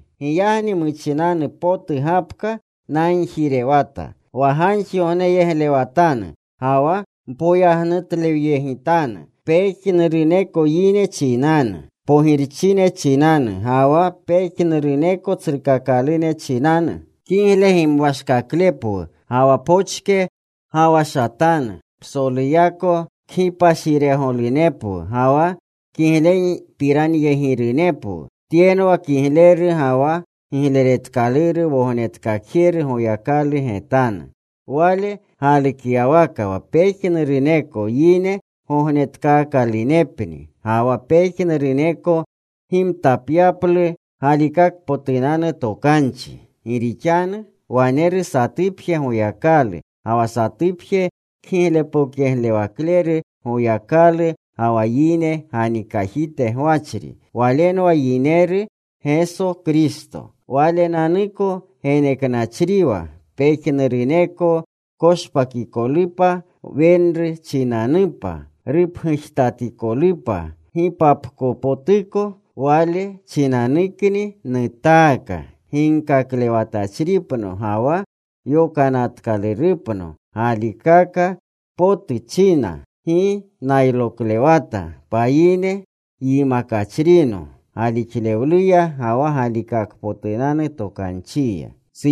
Giyagni muchinanu potu gapka nagjirewata, wa gagjigogneyegletwatanu ga wa mpoyagnutlewatanu pejnuruneko yine chinanu; pogirchine chinanu, ga wa pejnuruneko tsrukakalune chinanu, kigle gimwashkaklepwu ga wa pochke gawashatanu, psoluyako kgipashiregolunepwu ga wa kiglepiranyegirunepwu. Tyenwa kigleru ga wa gigleretkaluru Wognetkakjeru Goyakalu getanu. Wale galukyawaka wa pejnuruneko yine gognetkaakalunepni, ga wa pejnuruneko gimtapyaplu galikakpotunanu tokanchi. Gi rixanu waneru satupje Goyakalu, ga wa satupje kgiglepokyeglewakleru Goyakalu ga wa yine ganikajite gwachri. Walenwa yineru Geso Kristo. Walenanuko geneknachriwa pejnuruneko koshpakikolu wenru chinanupa, rupgujtatikolupa gipapkopotuko. Wale chinanukni nutaaka, ginkaklewatachripno ga wa yokanatkalurupno. Galikaka potu nchina. Gi nayloklewata. Payine yimakachrino galixlewluya ga wa galikakpotunanu tokanchiya.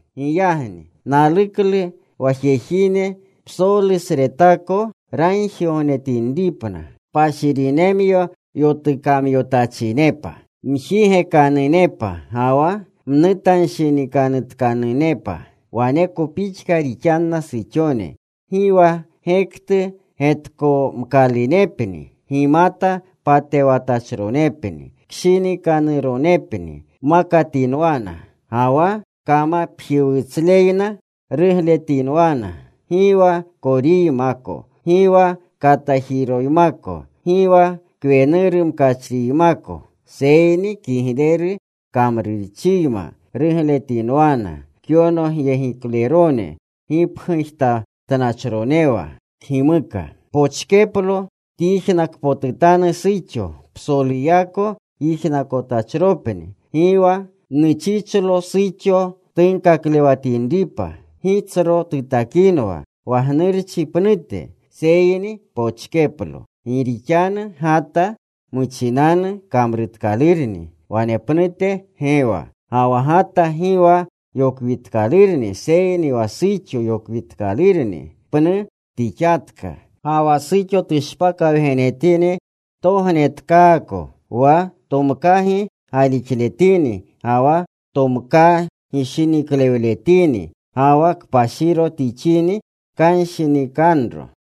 Giyagni naluklu wa jejine psolusretako ragjigognetinripna, kpashirinemyo yotukamyotachinepa. Mjigekanunepa ga wa mnutanshinikanutkanepa. Waneko pixka rixanna suxone. Gi wa gektu getkomkalunepni, gimata patewtachronepni, kshinikanuronepni makatinwana. Gi wa kamapjiwutsluyma rugletinwana, gi wa koriymako, gi wa katajirojiymako, gi wa kwenuru mkachriymako, seyni kigleru kamrurchiyma rugletinwana, kyonogyegiklerone gipgujtatnachronewa kgimuka. Pochkeplo tyijnakpotutanu suxo. Psoluyako yijnakotachropni. Gi wa nuchichlo suxo tunkaklewatinripa, gi tsro tutakinwa wa gnurchi pnute. Seyni pochkeplo. Gi rixanu Gata muchinanu kamrutkalurni. Wanepnute Gewa. Ga wa Gata gi wa yokwitkalurni, seyni wa suxo yokwitkalurni pnu tixatka. Ga wa suxo tushpakawgenetini tognetkaako, wa tomkagi galixletini ga wa tomkaa gishiniklewletini, ga wa kpashiro tixini, kanshinikanuro.